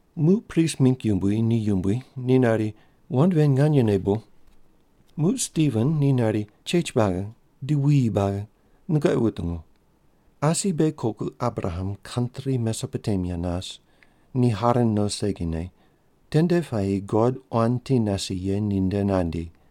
Muq prist mingg yumbui ni yumbui ni nari, “Wand ven nganyene bu?” Muq Stiven ni nari, “Chech buagi di wuyi buagi, nungoqi wutungu! Asi beghi koku Abraham kantri Mesopotemia nas, ni Haran no segine, tende puayi God quan ti nase ye ninde nandi.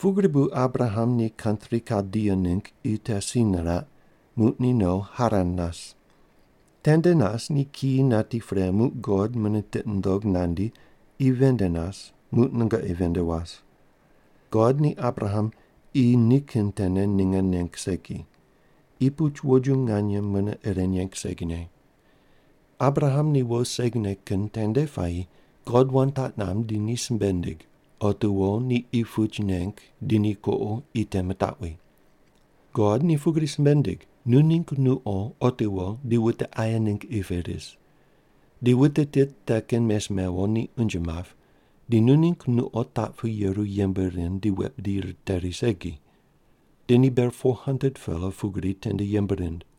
Pugri bu Abraham ni kantri Kaldia ningg qi te si niraq, muq ni no Haran nas. Tende nas ni kiyi nati pre muq God mune tiqi nundog nandi qi ven nde nas, muq nungoqi ven nde was. God ni Abraham qi nikin tene ninge neng segi. Qi puch woju nganye mune ire neng segine. Abraham ni wo segine kin tende puayi God wand taq namb di ni simbe nindig, otiwo ni qi puch neng di ni kuqo qi te mitaqwi. God ni pugri simbe nindig, ‘Nu ningg nuqo otiwo di wute aye ningg qi pe ris. Di wute tit te kin mes mewo ni unje map, di nu ningg nuqo taq pu yeru yembe rind di wet bidi riteri segi. Di ni ber 400-pela pugri tende yembe rind.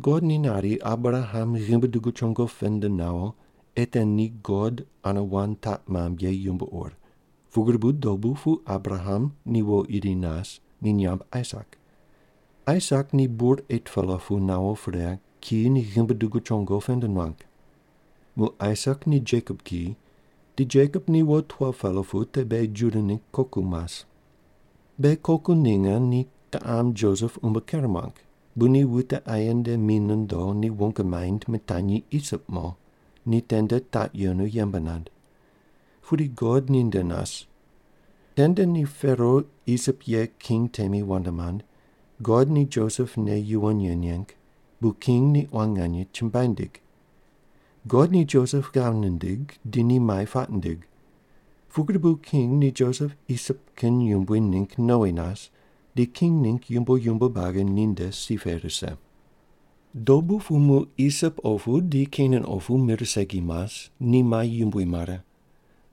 God ni nari Abraham ghimbi dugu chongo pend nawo ei te ni God ane wand taq mamb ye yumbo ur, pugri bu dobu pu Abraham ni wo iri nas, ni nyamb Aisak. Aisak ni bur 8-pela pu nawo pre kiyi ni ghimbi dugu chongo pend nuang. Muq Aisak ni Jekop kiyi, di Jekop ni wo 12-pela pu te beghi Juda ningg koku mas. “Beghi koku ninge ni kiqam Josep umbo ker muang, bu ni wute aye nde mi nondo ni wong maind mitanyi Isip mo ni tende taq yenu yembe nand. Pudi God ninde nas. Tende ni Pero Isip ye king temi wand mand, God ni Josep nei yuwon ye neng, bu king ni quan nganye chumbuai nindig. God ni Josep ghav nindig, di ni mai puaq nindig. Pugri bu king ni Josep Isip kin yumbui ningg nowi nas, di king ningg yumbo yumbo buagi ninde si pe rise. “Dobu pu muq Isip opu di Kenan opu mir segi mas, ni mai yumbui mare.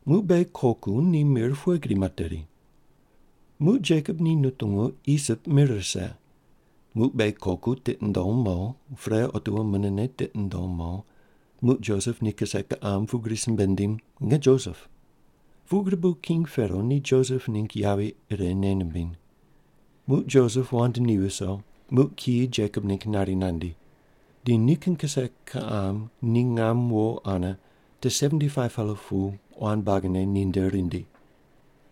Muq beghi koku ni mir pughe gri materi? Muq Jekop ni nutungu Isip mir rise. Muq beghi koku tiqi nundom mo, pre otiwo munene tiqi nundom mo, muq Josep ni kise kiqam pugri simbe nindim, ‘Nge Josep.’ Pugri bu king Pero ni Josep ningg yavi ire nei nimbim. Muq Josep wand ni viso, muq kiyi Jekop ningg nari nandi. Di nikin kise kiqam ni ngam wo ane te 75-pela pu quan buagine ninde rindi.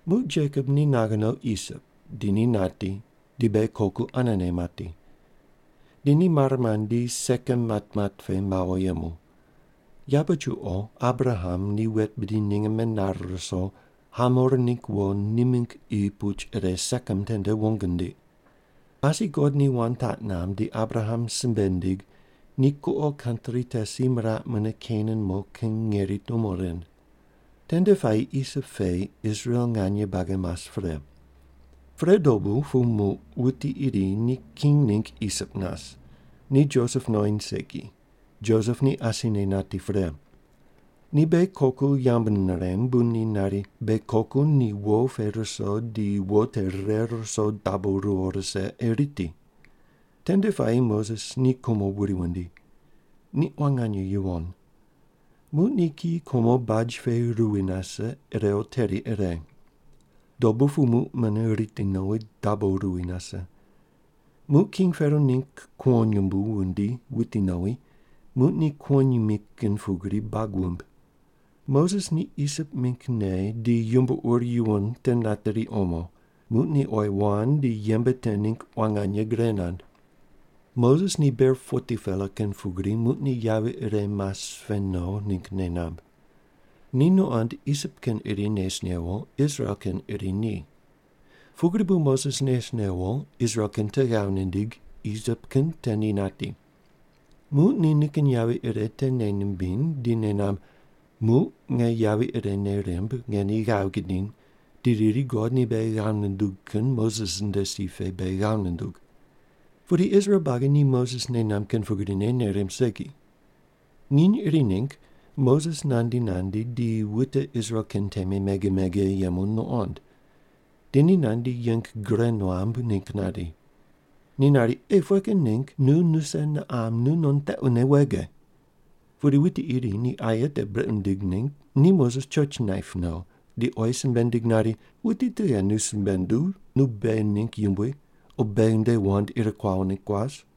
“Muq Jekop ni naghe no Isip, di ni nati, di beghi koku anene mati. Di ni mare mandi, Sekem matmat pe mawo yemu. Yabe chuqo Abraham ni wet bidi ninge menare ruso, Hamor ningg wo ni mingg qi puch ire Sekem tende wong nindiq. “Asi God ni wand taq namb di Abraham simbe nindig ni kuqo kantri te si miraq mune Kenan mo kin ngeri tumo rind. Tende puayi Isip pe Israel nganye buagi mas pre. Pre dobu pu muq wuti iri ni king ningg Isip nas, ni Josep nuqoind segi. Josep ni asine nati pre. Ni beghi koku yambu nirem, bu ni nari, beghi koku ni wo pe ruso di wo te rire ruso dabo ruwo rise ei riti. Tende puayi Moses ni kumo wuri wundi. Ni quan nganye yuwon. Muq ni kiyi kumo baj pe ruwi nase irew teri ire. Dobu pu muq mune riti nowi, dabo ruwi nase. Muq king Pero ningg kuwonyumbu wundi wuti nowi, muq ni kuwonyimi kin pugri bag wuimb. Moses ni Isip mingg nei di yumbo ur yuwon te nateri omo, muq ni oyi wand di yembe te ningg quan nganye gre nand. “Moses ni ber 40-pela kin pugri muq ni yavi ire mas pe no ningg nei namb. Ni nuqond Isip kin iri nes newo, Israel kin iri ni. Pugri bu Moses nes newo Israel kin te ghav nindig Isip kin te ni nati. Muq ni nikin yavi ire te nei nimbiny di nei namb, ‘Muq nge yavi ire nei rimb nge ni ghav gidiny, di riri, “God ni beghi ghav nundug kin Moses nde si pe beghi ghav nundug”.’ Pudi Israel buagi ni Moses nei namb kin pugrine nei rimb segi. “Nginy iri ningg Moses nandi nandi di wute Israel kin temi mege mege yemu nuqond. Di ni nandi yeng gure nuam ningg nandi. Ni nari, ‘Ei, pughe kin ningg nu nuse niqam nunon tequne wege?’ “Pudi wuti iri ni aye te brequ nindig ningg ni Moses choch naip no, di oyi simbe nindig nari, ‘Wuti tughe nu simbe nunduw nu beghi ningg yumbui o beghi nde wand ir kuawo ningg kuas?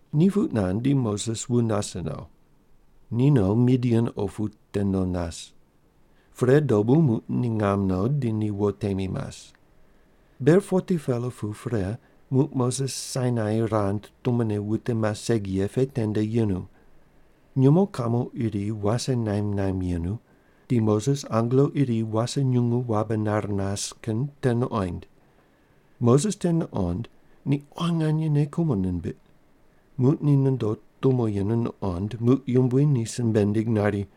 “Ni puq nand, di Moses wu nase no. Ni no, Midian opu te no nas. Pre, dobu muq ni ngam no, di ni wo temi mas. Ber 40-pela pu pre muq Moses Sainai rand tumone wute mas segi ye pe tende yenu. Nyumo kamo iri wase naimb naimb yenu, di Moses angelo iri wase nyungu wabe nar nas kin te nuqoind. Moses te nuqond, ni quan nganye nei kumo nimbiq. Muq ni nondo tumo yenu nuqond muq Yumbui ni simbe nindig nari,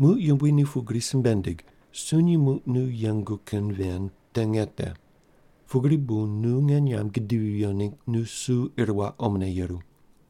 “Muq Yumbui ni pugri simbe nindig, ‘Sunyi muq nu yengu kin ven te nge te. Pugri bu nu nge nyamb gudivi viyo ningg nu su ir waq omone yeru.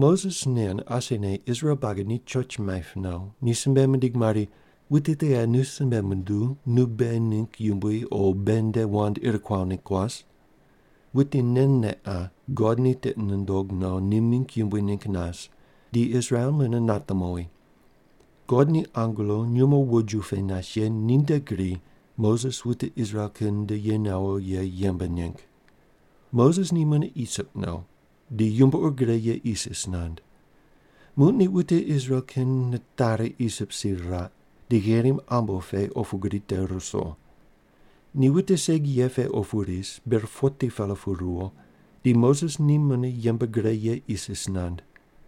“Moses nen asine Israel buagi ni choch maip no, ni simbe mindig mari, ‘Wuti tughe nu simbe nunduw nu beghi ningg yumbui o beghi nde wand ir kuawo ningg kuas?’ Wuti nen ne qa God ni tiqi nundog no ni mingg yumbui ningg nas di Israel mune nate mowi. God ni angelo nyumo woju pe nas ye ninde gri Moses wute Israel kin nde ye nawo ye yembe neng. Moses ni mune Isip no, di yumbo ur gre ye isis nand. Muq ni wute Israel kin nitari Isip si riraq, di Gherim Ambo pe opu gri te ruso. Ni wute segi ye pe opu ris, ber 40-pela pu ruwo, di Moses ni mune yembe gre ye isis nand.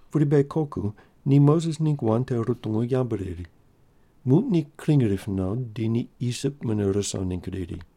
“Pudi beghi koku ni Moses ningg wand te rutungu yambu riri. Muq ni kring rip no, di ni Isip mune ruso ningg riri.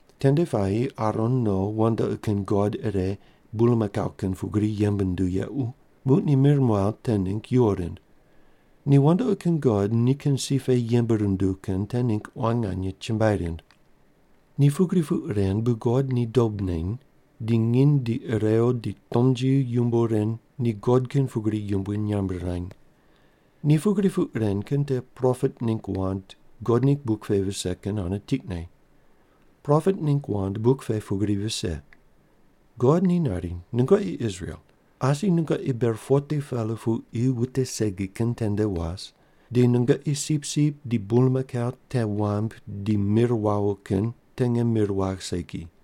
Tende puayi Aron no wandoqi kin god ire bulmakau kin pugri yembe nunduw yequ, muq ni mir muaw te ningg yuwo rind. Ni wandoqi kin god nikin si pe yembe runduw kin te ningg quan nganye chumbuai rind. “Ni pugri puq ren bu God ni dob neny, di nginy di irew di tomnji yumbo ren ni god kin pugri yumbui nyamb rirany. Ni pugri puq ren kin te propet ningg wand God ningg buk pe vise kin ane tiqne. Propet ningg wand buk pe pugri vise: God ni nari, ‘Nungoqi Israel, asi nungoqi ber 40-pela pu qi wute segi kin tende was, di nungoqi sipsip di bulmakau te wambui di mir wawo kin te nge mir wagh segi.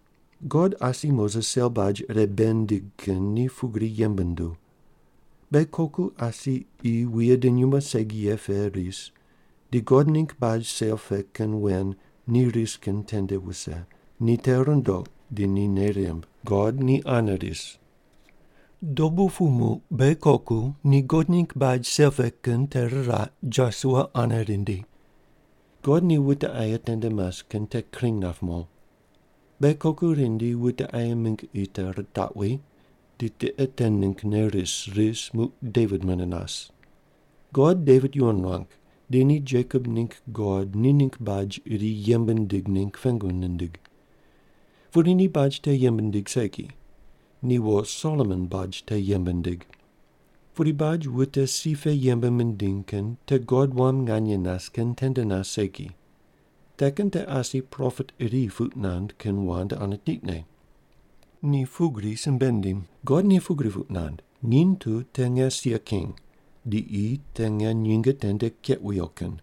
“God asi Moses sel baj ire bei nindig kin ni pugri yembe nunduw. Beghi koku asi qi wuye di nyumo segi ye pe ris, di God ningg baj sel pe kin wen ni ris kin tende wuse, ni te rundoq di ni nei rimb, God ni ane ris. Dobu pu muq beghi koku ni God ningg baj sel pe kin te riraq Josua ane rindi. God ni wute aye tende mas kin te kring nap mo. Beghi koku rindi wute aye mingg qi te ritaqwi, di tiqe te ninggne ris ris muq Devit mune nas. God Devit yuwon nuang, di ni Jekop ningg God ni ningg baj iri yembe nindig ningg pengu nindig. Pudi ni baj te yembe nindig segi. Ni wo Solomon baj te yembe nindig. Pudi baj wute si pe yembe mindiny kin te God wam nganye nas kin tende nas segi. Te kin te asi propet iri puq nand kin wand ane tiqne. Ni pugri simbe nindim: God ni pugri puq nand, ‘Nginy tu te nge sia king, di qi te nge nyinge tende keq wuyo kin.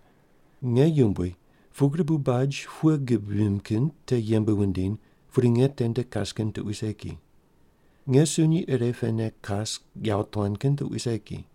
Nge yumbui, pugri bu baj pughe gib vimb kin te yembe wundiny, pudi nge tende kas kin tuqui segi. Nge sunyi ire pene kas yawotuan kin tuqui segi.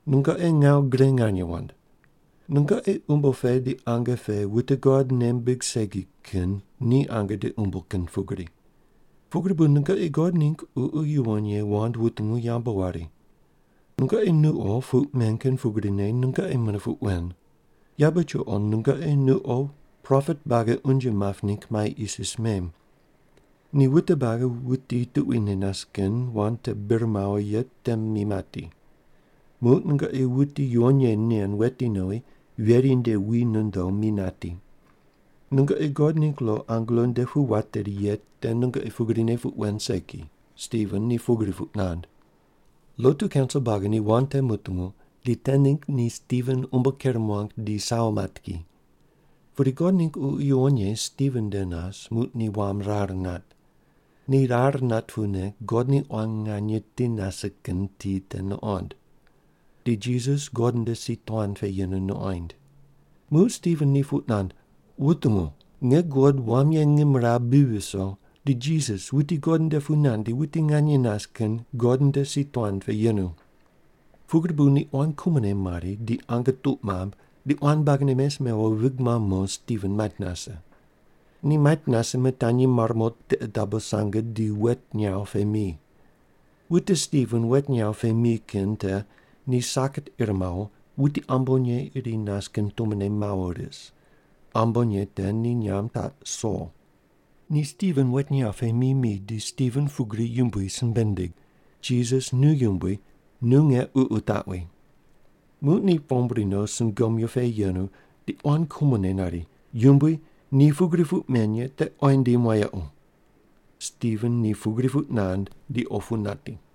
“Nungoqi ngawu gre nganye wand. Nungoqi umbo pe di ange pe wute God nei mimbig segi kin ni ange di umbo kin pugri. Pugri bu nungoqi God ningg Ququ Yuwon Ye wand wutungu yambu wari. Nungoqi nuqo puq men kin pugrine nungoqi mune puq wen. Yabe chuqo nungoqi nuqo propet buagi unje map ningg mai isis mem. Ni wute buagi wuti tuquine nas kin wand te bir mawo ye te mi mati. Muq nungoqi wuti yuwon ye nen wetinowi veri nde wi nondo mi nati. Nungoqi God ningg lo angelo nde pu wateri ye te nungoqi pugrine puq wen segi!” Stiven ni pugri puq nand. Lotu kaunsil buagi ni wand te mutungu, di te ningg ni Stiven umbo ker muang di sawo mat ki. Pudi God ningg Ququ Yuwon Ye Stiven nde nas, muq ni wam rar nat. Ni rar nat pune God ni quan nganye ti nase kin ti te nuqond. Di Jisas God nde si tuan pe yenu nuqoind. Muq Stiven ni puq nand, “Wutungu! Nge guqod wam ye ngimrawu bi viso, di Jisas wuti God nde pu nandi wuti nganye nas kin God nde si tuan pe yenu.” Pugri bu ni quan kumone mari di ange tuq mamb, ni quan buagine mes mewo vig mamb mo Stiven mait nase. Ni mait nase mitanyi mar mo tiqe dabo sange di wet nyaw pe mi. Wute Stiven wet nyaw pe mi kin te ni saket ir mawo, wuti ambonye iri nas kin tumone mawo ris. Ambonye te ni nyamb taq Sol. Ni Stiven wet nyaw pe mi mi di Stiven pugri Yumbui simbe nindig, “Jisas nu Yumbui, nu nge ququ taqwi!” Muq ni pombri no sungomyu pe yenu di quan kumone nari, “Yumbui, ni pugri puq men ye te oyi ndim wayequ.” Stiven ni pugri puq nand, di opu nati.